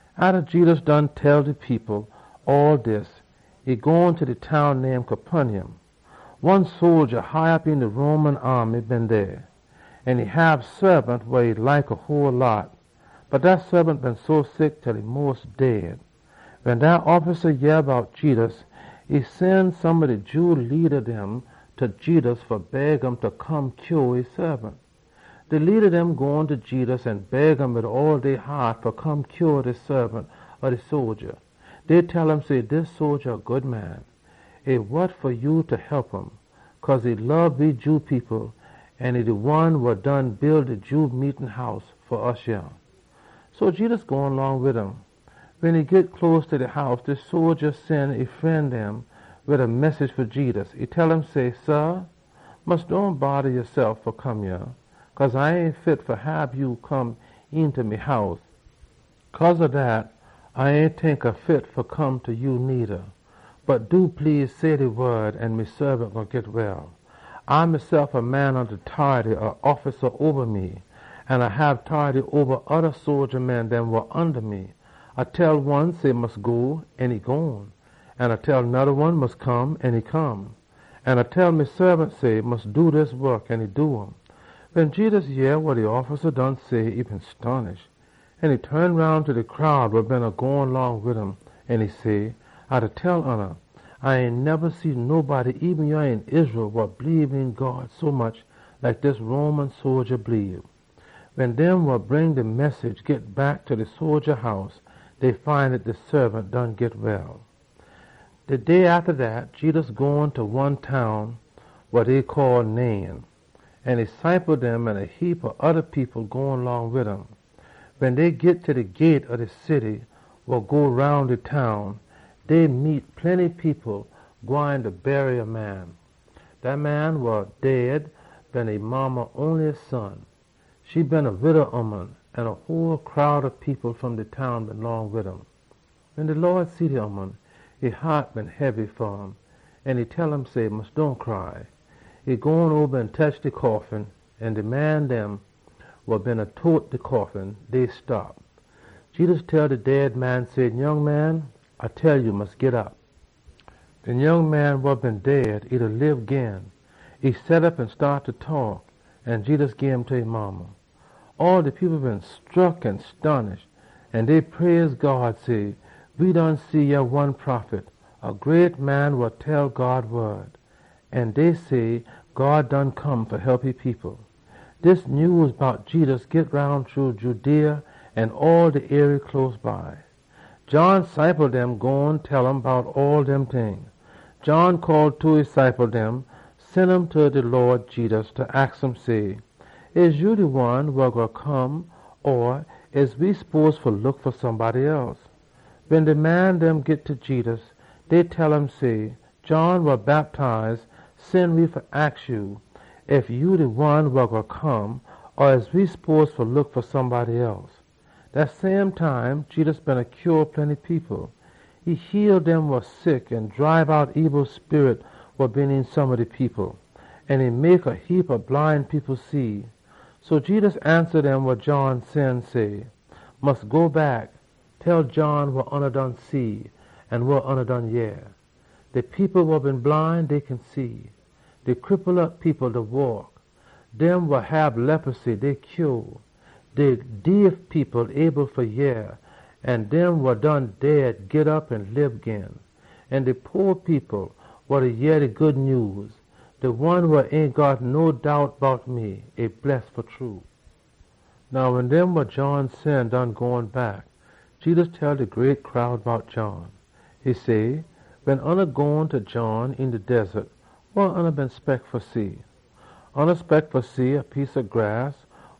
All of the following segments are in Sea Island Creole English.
Atta Jedus done tell de people all dis, e gone ta de town name Capernaum. One sodja high op een de Roman aamy been dey. E hab saabant wa e like a whole heap, bot dat saabant been sick til e mos dead. Wen dat offisa yeh bout Jedus, e sen some ob de Jew leada dem ta Jedus fa beg um fa come heal e saabant. De leada dem gone ta Jedus an beg um wid all dey haat fa come heal de saabant ob de sodja. Dey tell um say, “Dis sodja a good man an e good fa hep um. Cause e lob de Jew people, an e de one wa done build de Jew meetin house fa we yah.” So Jedus gone long wid um. Wen e git close ta de house, de sodja sen e fren dem wid a message fa Jedus. E tell um say, “Sah, mus dohn bodda yasef fa come yah, cause A ain fit fa hab ya come eenta me house. Cause ob dat, A ain tink A fit fa come ta ya needa. Bot do please, say de wod an me saabant gwine git well. A mesef a man onda tority ob offisa oba me, an A hab tority oba oda sodja dem wa onda me. A tell one say, ‘Mus go!’ an e gone. An A tell noda one say, ‘Mus come!’ an e come. An A tell me saabant say, ‘Mus do dis wok!’ an e do um.” Wen Jedus yeh wa de offisa done say, e been stonish. E ton roun ta de crowd wa beena gone long wid um, an e say, “A da tell oona, A ain neba see nobody eben yah een Israel wa bleebe een God sommuch like dis Roman sodja bleebe!” Wen dem wa bring de message git back ta de sodja house, dey find dat de saabant done git well. De day atta dat, Jedus gone ta one town wa dey call Nain, an e ciple dem an a heapa oda people gone long wid um. Wen dey git ta de gate ob de wall wa go roun de town, dey meet plenty people gwine fa bury a man. Dat man wa dead been e modda onliest son. E been a wida ooman, an a whole crowd ob people fom de town been long wid um. Wen de Lawd see de ooman, e haat been hebby fa um, an e tell um say, “Mus dohn cry!” E gone oba an tetch de coffin, an de man dem wa beena tote de coffin, dey stop. Jedus tell de dead man say, “Nyoung man, A da tell ya say, mus git op.” De nyoung man wa been dead, e set op an staat fa taak. An Jedus gim ta e modda. All de people been scruck an stonish, an dey praise God, say, “We done see one prophet mongst we!” An dey say, “God done come fa hep e people!” Dis nyews bout Jedus git roun shru Judea an all de arie close by. John ciple dem gone tell um bout all dem ting. John call two ob e ciple dem, sen um ta de Lawd Jedus fa aks um say, “Ya de one wa been gwine fa come, or we spose fa look fa somebody else?” Wen de man dem git ta Jedus, dey tell um say, “John wa Bactize sen we fa aks ya ef ya de one wa been gwine fa come, or we spose fa look fa somebody else.” Dat same time, Jedus beena heal plenty people. E heal dem wa sick, an e dribe out ebil sperit wa been een some ob de people, an e mek a heapa bline people see. So Jedus ansa dem wa John sen, say, “Mus go back, tell John wa oona done see an wa oona done yeh. De people wa been bline, dey kin see. De cripple op people da waak. Dem wa hab leposy, dey git clean. De deef people able fa yeh, an dem wa done dead git op an lib gin. An de po people da yeh de Good Nyews. De one wa ain got no doubt bout me, e bless fa true!” Now wen dem wa John sen done gone back, Jedus tell de great crowd bout John. E say, “Wen oona gone ta John een de wildaness, wa oona been spect fa see? Oona spect fa see a piece ob grass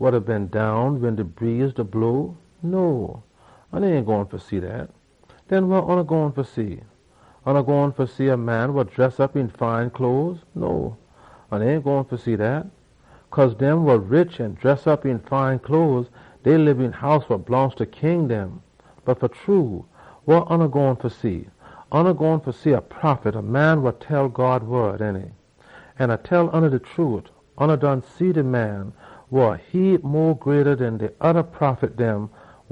wa da bend down wen de breeze da blow? No, oona ain gone fa see dat. Den wa oona gone fa see? Oona gone fa see a man dress op een fine cloes? No, oona ain gone fa see dat. Cause dem wa rich an dress op een fine cloes, dey lib een house wa blongst ta king dem. Bot fa true, wa oona gone fa see? Oona gone fa see a prophet, ainty? An A da tell oona de trute, oona done see de man wa a heap mo greata den de oda prophet dem.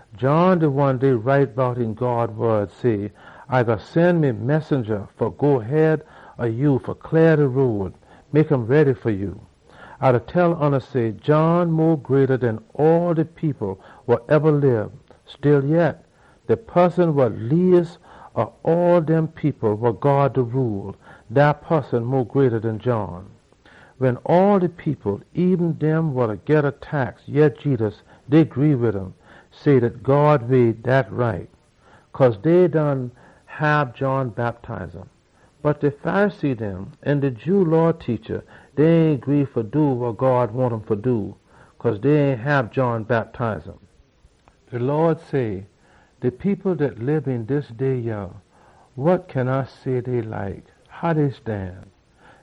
John de one dey been write bout een God wod, say, ‘A gwine sen me messenja fa go head ob ya fa cleah de road an mek um ready fa ya.’ A da tell oona say, John mo greata den all de people wa eba lib. Stillyet, de poson wa leas ob all dem people wa God da rule, dat poson mo greata den John!” Wen all de people, eben dem wa da geda tax, yeh Jedus, dey gree wid um, say dat God way, e right. Cause dey done hab John bactize um. Bot de Pharisee dem an de Jew Law teacha dem, dey ain gree fa do wa God wahn um fa do, cause dey ain hab John bactize um. Jedus say, “De people dat lib een dis day yah, wa kin A say dey like? How dey stan?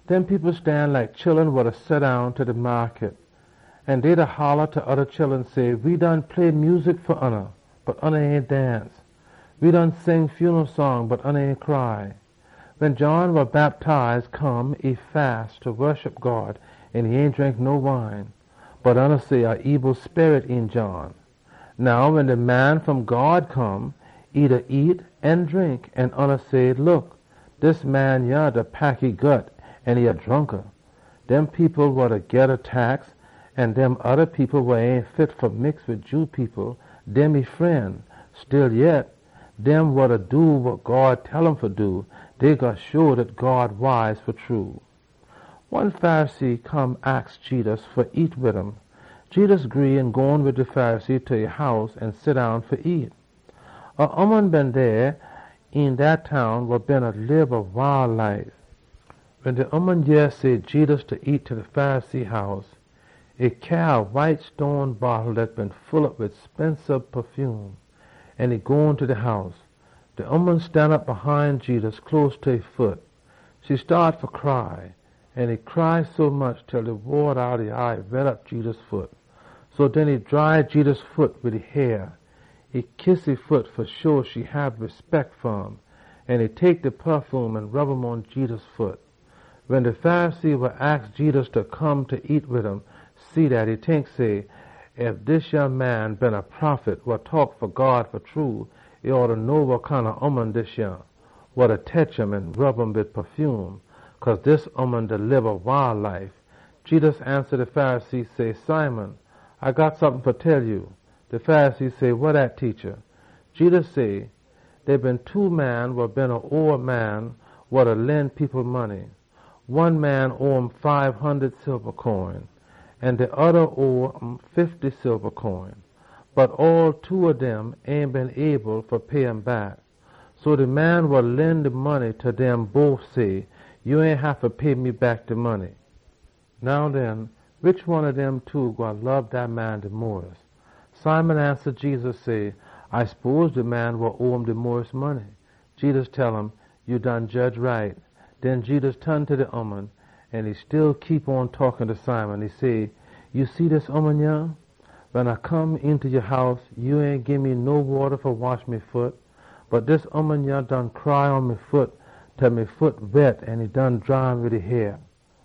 Dem people stan like chullun wa da seddown ta de maakut. An dey da holla ta oda chullun, say, ‘We done play music fa oona, bot oona ain dance! We done sing sompin saaful, bot oona ain cry!’ Wen John wa Bactize come, e fast fa woshup God an e ain drink no wine. Bot oona say, ‘A ebil sperit een John.’ Now wen de Man wa Come fom God come, e da nyam an drink. An oona say, ‘Look, dis man yah da pack e gut an e a dronka! Dem people wa da geda tax an dem oda people wa ain fit fa mix wid Jew people, dem e fren!’ Stillyet, dem wa da do wa God tell um fa do, dey gwine show dat God wise fa true.” One Pharisee come aks Jedus fa nyam wid um. Jedus gree an gone wid de Pharisee ta e house an seddown fa nyam. A ooman been dey een dat town wa beena lib loose life. Wen de ooman yeh say Jedus beena nyam ta de Pharisee house, e cyaa a white stone bottle dat been full op wid spensiz pafume, an e gone ta de house. De ooman stanop hine Jedus, close ta e foot. E staat fa cry, an e cry sommuch til de wata outta e eye wet op Jedus foot. So den, e dry Jedus foot wid e hair. E kiss e foot an e tek de pafume an rub um pon Jedus foot. Wen de Pharisee wa aks Jedus fa come fa nyam wid um see dat, e tink say, “Ef dis yah man been a prophet fa true, e been gwine know wa kinda ooman dis yah, wa da tetch um an rub um wid pafume. Cause dis ooman da lib a loose life.” Jedus ansa de Pharisee say, “Simon, A got sompin fa tell ya.” De Pharisee say, “Wa dat, Teacha?” Jedus say, “Dey been two man wa beena owe a man wa lend people money. One man owe um fibe hundud silba coin, an de oda owe um fifty silba coin. Bot all two ob dem ain been able fa pay um back. So de man wa lend de money tell dem bof say, ‘Ya ain haffa pay me back de money.’ Now den, wish one ob dem two gwine lob dat man mo?” Simon ansa Jedus say, “A spose de man wa owe um mo money.” Jedus tell um, “Ya done jedge right.” Den Jedus ton ta da ooman an e still beena taak ta Simon. E say, “Ya see dis ooman, yah? Wen A come eenta ya house, ya ain gii me no wata fa wash me foot. Bot dis ooman yah done cry pon me foot, til me foot wet an e done dry um wid e hair.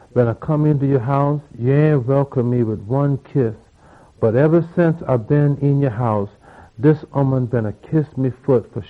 Wen A come eenta ya house, ya ain welcome me wid one kiss, bot eba since A been yah, dis ooman beena kiss me foot.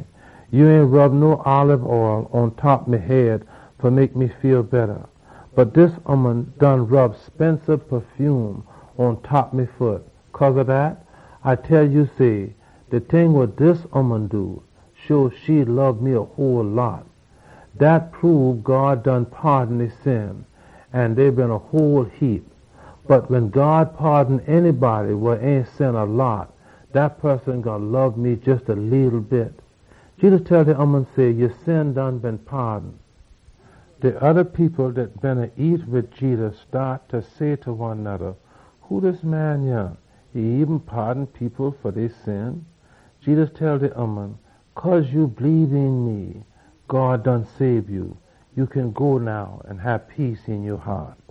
Ya ain rub no olib oll pontop me head fa mek me feel betta, bot dis ooman done rub spensiz pafume pon me foot. Cause ob dat, A da tell ya say, de ting wa dis ooman done show e lob me a whole heap. Dat show God done paadon e sin, an dey been a whole heap. Bot wen God paadon a poson wa ain sin a whole heap, dat poson gwine lob me jes a leetle bit.” Jedus tell de ooman say, “Ya sin done been paadon.” De oda people dat beena nyam wid Jedus staat fa say ta one noda, “Who dis man yah? E eben paadon people fa dey sin!” Jedus tell de ooman, “Cause ya bleebe een me, God done sabe ya. Ya kin go now an hab peace een ya haat.”